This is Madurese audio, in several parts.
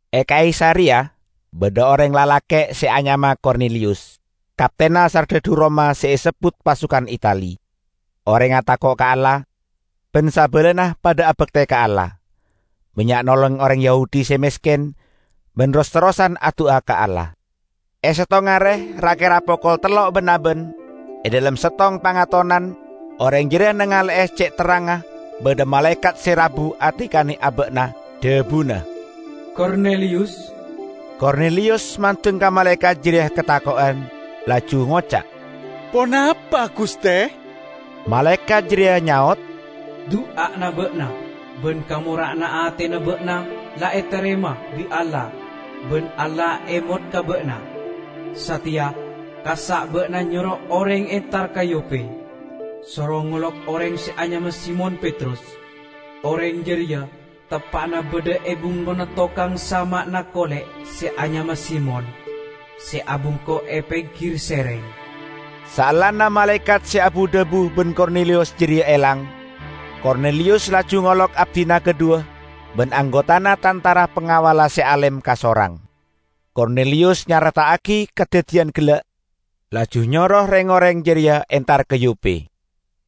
E Kaisareya badha oreng lalake' se anyama Korneliyus, kaptenna sardhadhu Roma se esebbut "Pasukan Itali". Orengnga tako' ka Allah, ban sabalana padha abakte ka Allah. Bannya' nolong oreng Yahudi se mesken, ban ros-terrosan adu'a ka Allah. E settong are ra-kera pokol tello' ban-aban e dhalem settong pangatonan oreng jareya nangale'e ce' terrangnga badha malaekat se rabu adikane aba'na, dhabuna, "Korneliyus!" Korneliyus mandeng ka malaekat jareya katako'an, laju ngoca', "Ponapa, guste?" Malaekat jareya nyaot, "Du'ana ba'na ban kamora'anna atena ba'na la etarema bi' Allah ban Allah emot ka ba'na. Sateya kassa' ba'na nyoro oreng entar ka Yope, soro ngolok oreng se anyama Simon Petrus. Oreng jareya teppa'na badha e bengkona tokang sama'na kole' se anyama Simon, se abengko e penggir sereng." Saellana malaekat se abu-dhabu ban Korneliyus jareya elang, Korneliyus laju ngolok abdina kadhuwa ban anggotana tantara pangawalla se alem kasorang. Korneliyus nyareta'agi kadaddiyan gella', laju nyoro reng-oreng jareya entar ka Yope.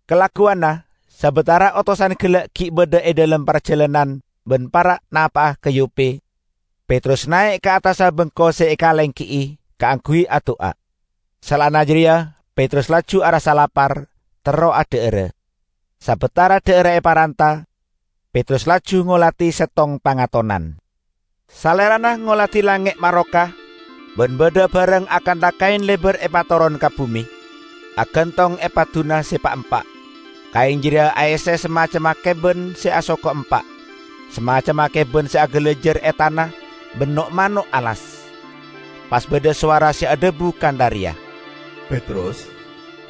Kalagguwanna, sabatara otosan gella' gi' badha e dhalem parjalanan ban para' napa'a ka Yope, Petrus nae' ka attassa bengko se ekalenggi'i, kaangguy adu'a. Saellana jareya Petrus laju arassa lapar, terro adha'ara; sabatara dha'arra eparanta, Petrus laju ngoladi settong pangatonan. Salerana ngoladi langnge' maroka ban badha barang akantha kaen lebar epatoron ka bume, agantong e padduna se pa'-empa'. Kaen jareya aesse samacemma keban se asoko empa', samacemma keban se agalajar e tana ban no'-mano' alas. Pas badha sowara se adhabu kantha reya, "Petrus,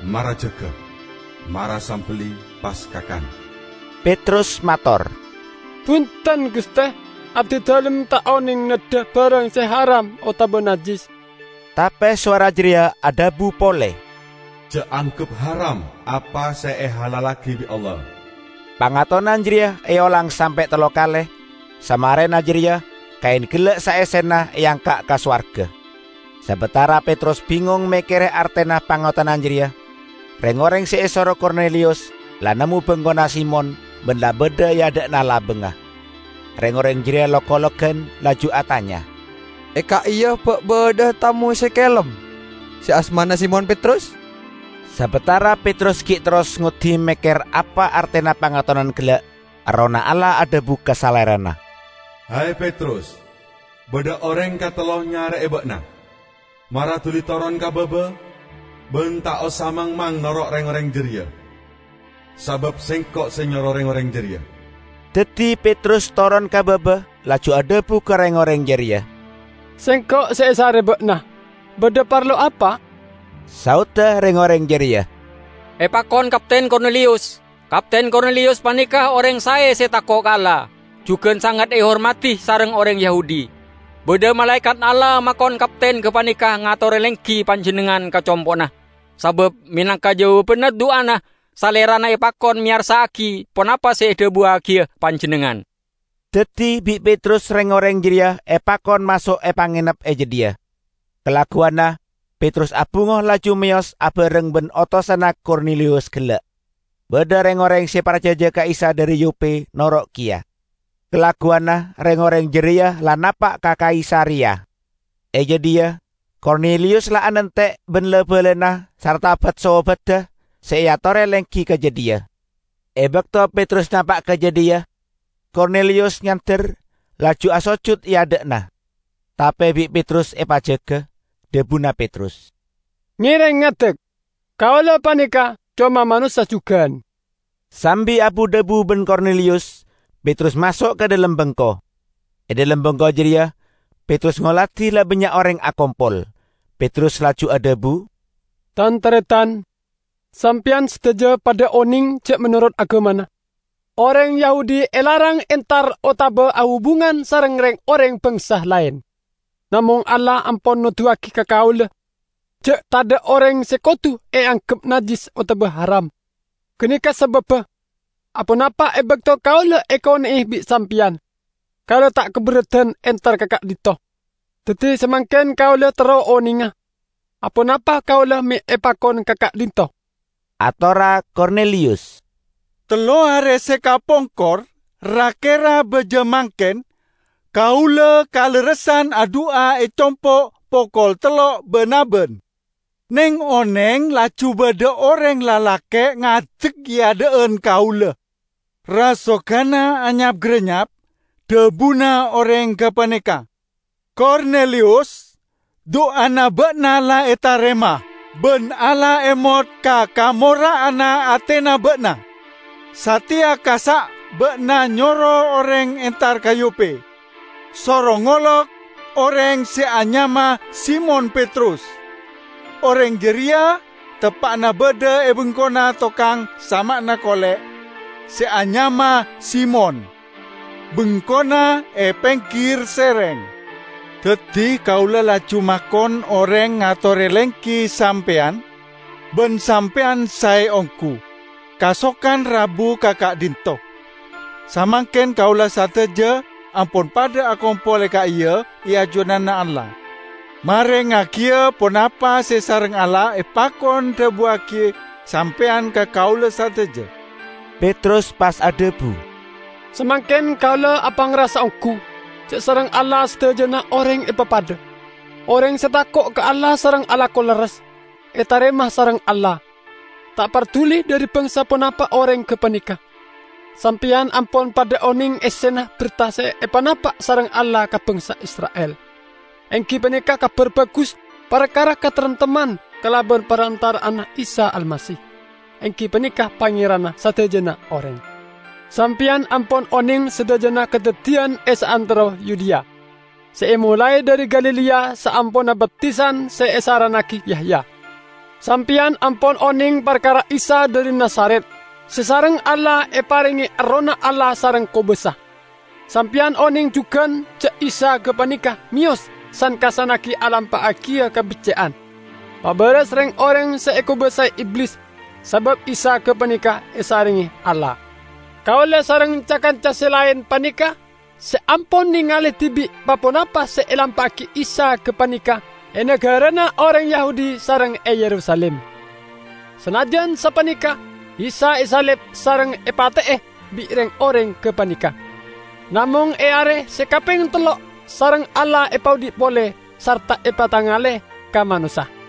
mara jaga! Mara sambelli, pas kakan!" Petrus mator, "Bunten, Guste! Abdidalem ta' oneng neddha barang se haram otaba najjis." Tape sowara jareya adhabu pole, "Ja' anggep haram apa se ehalallagi bi' Allah." Pangatonan jareya eolang sampe' tello kale, samarena jareya kaen gella' saessena eangka' ka sowarga. Sabatara Petrus bingong mekkere artena pangatonan jareya, reng-oreng se esoro Korneliyus la nemmo bengkona Simon ban la badha e adha'na labangnga. Reng-oreng jareya lok-ologan laju atanya, "E ka'iya ba' badha'a tamoy se kelem, se asmana Simon Petrus?" Sabatara Petrus gi' terros ngoddi mekker apa artena pangatonan gella', Errohna Allah adhabu ka salerana, "He, Petrus, badha oreng katello nyare'e ba'na. Mara duli toron ka baba ban ta' osa mangmang noro' reng-oreng jareya, sabab Sengko' se nyoro reng-oreng jareya." Daddi Petrus toron ka baba laju adhabu ka reng-oreng jareya, "Sengko' se esare ba'na. Badha parlo apa?" Saodda reng-oreng jareya, "Epakon Kapten Korneliyus. Kapten Korneliyus paneka oreng sae se tako' ka Allah, jugan sanget ehormadi sareng oreng Yahudi. Badha malaekat Allah makon kapten gapaneka ngatore lenggi panjennengngan ka compo'na, sabab, menangka jawabanna du'ana, salerana epakon meyarsa'agi ponapa se edhabuwagiya panjennengngan." Daddi bi' Petrus reng-oreng jareya epakon maso' epangenep e jadhiya. Kalagguwanna Petrus abungo laju meyos abareng ban otosanna Korneliyus gella'. Badha reng-oreng se parcaja ka Isa dhari Yope noro' keya. Kalagguwanna reng-oreng jareya la napa' ka Kaisareya. E jadhiya Korneliyus la anante' ban la-balana sarta bat-sobadda se eatore lenggi ka jadhiya. E bakto Petrus napa' ka jadhiya, Korneliyus nyander, laju asojut e adha'anna. Tape bi' Petrus epajaga. Dhabuna Petrus, "Ngereng ngadek! Kaula paneka coma manossa jugan." Sambi abu-dhabu ban Korneliyus, Petrus maso' ka dhalem bengko. E dhalem bengko jareya Petrus ngoladi la bannya' oreng akompol. Petrus laju adhabu, "Tan-taretan, sampeyan sadaja padha oneng ja' menorot agamana, oreng Yahudi elarang entar otaba ahubungan sareng reng-oreng bangsa laen. Namong Allah ampon noduwagi ka kaula ja' tadha' oreng se kodu eanggep najjis otaba haram. Ganeka sababba, aponapa e bakto kaula ekone'e bi' sampeyan, kaula ta' kaberradan entar ka ka'dhinto'. Daddi samangken kaula terro onenga aponapa kaula me' epakon ka ka'dhinto'." Atorra Korneliyus, "Tello are se kapongkor, ra-kera baja mangken, kaula kalerressan adu'a e compo' pokol tello' ban-aban. Neng-oneng laju badha oreng lalake' ngadek e adha'an kaula. Rasoganna anyap-garennyap. Dhabuna oreng gapaneka, 'Korneliyus! Du'ana ba'na la etarema, ban Allah emot ka kamora'anna atena ba'na. Sateya kassa' ba'na nyoro oreng entar ka Yope, soro ngolok oreng se anyama Simon Petrus. Oreng jareya teppa'na badha e bengkona tokang sama'na kole' se anyama Simon; bengkona e penggir sereng.' Daddi kaula laju makon oreng ngatore lenggi sampeyan, ban sampeyan sae onggu, kasokan rabu ka ka'dhinto'. Samangken kaula sadaja ampon padha akompol e ka'iya e ajunanna Allah, merengngagiya ponapa se sareng Allah epakon dhabuwagi sampeyan ka kaula sadaja." Petrus pas adhabu, "Samangken kaula apangrasa onggu ja' sareng Allah sadajana oreng epapadha. Oreng se tako' ka Allah sareng alako lerres, etarema sareng Allah, ta' parduli dhari bangsa ponapa oreng gapaneka. Sampeyan ampon padha oneng essena berta se epanapa' sareng Allah ka bangsa Isra'il, enggi paneka Kabar Bagus parkara kataremtemman kalaban parantara'anna Isa Almasih, enggi paneka Pangeranna sadajana oreng. Sampeyan ampon oneng sadajana kadaddiyan e saantero Yudea, se emolae dhari Galilea saamponna baptisan se esarannagi Yahya. Sampeyan ampon oneng parkara Isa dhari Nazaret se sareng Allah eparenge Errohna Allah sareng kobasa. Sampeyan oneng jugan ja' Isa gapaneka meyos san-kassannagi alampa'agiya kabecce'an; mabaras reng-oreng se ekobasae Iblis, sabab Isa gapaneka esarengnge Allah. Kaula sareng ca-kanca se laen paneka se ampon nengale dibi' pa-ponapa se elampa'agi Isa gapaneka e nagarana oreng Yahudi sareng e Yerusalim. Sanajjan sapaneka Isa esalib sareng epate'e bi' reng-oreng gapaneka. Namong e are se kapeng tello' sareng Allah epaodhi' pole, sarta epatengale ka manossa;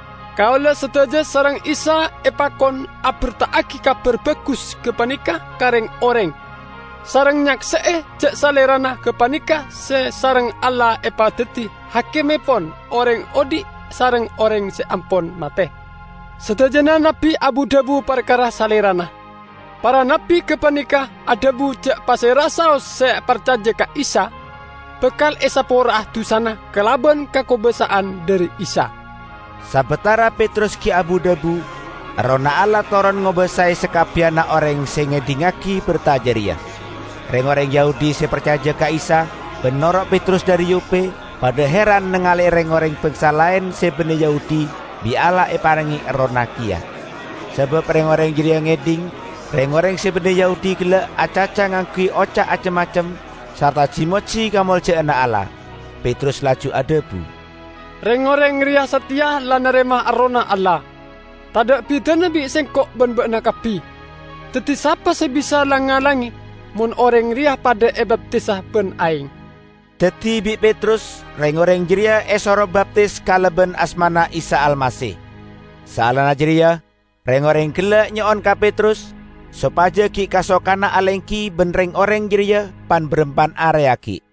Kaula sadaja sareng Isa epakon aberta'agi Kabar Bagus gapaneka ka reng-oreng, sareng nyakse'e ja' Salerana gapaneka se sareng Allah epadaddi Hakimmepon oreng odhi' sareng oreng se ampon mate. Sadajana nabbi abu-dhabu parkara Salerana. Para nabbi gapaneka adhabu ja' pasera'a saos se parcaja ka Isa, bakal esapora'a dusana kalaban kakobasa'an dhari Isa." Sabatara Petrus gi' abu-dhabu, Errohna Allah toron ngobasae sakabbiyanna oreng se ngedhingngagi berta jareya. Reng-oreng Yahudi se parcaja ka Isa ban noro' Petrus dhari Yope padha heran nangale'e reng-oreng bangsa laen se banne Yahudi bi' Allah eparenge Errohna keya. Sabab reng-oreng jareya ngedhing reng-oreng se banne Yahudi gella' acaca ngangguy oca' acem-macem sarta ji-moji kamolja'anna Allah. Petrus laju adhabu, "Reng-oreng reya sateya la narema Errohna Allah, tadha' bidana bi' sengko' ban ba'na kabbi. Daddi sapa se bisa lang-ngalange mon oreng reya padha ebaptisa ban aeng?" Daddi bi' Petrus reng-oreng jareya esoro baptis kalaban asmana Isa Almasih. Saellana jareya reng-oreng gella' nyo'on ka Petrus sopaja gi' kasokana alenggi ban reng-oreng jareya pan-barampan are aggi'.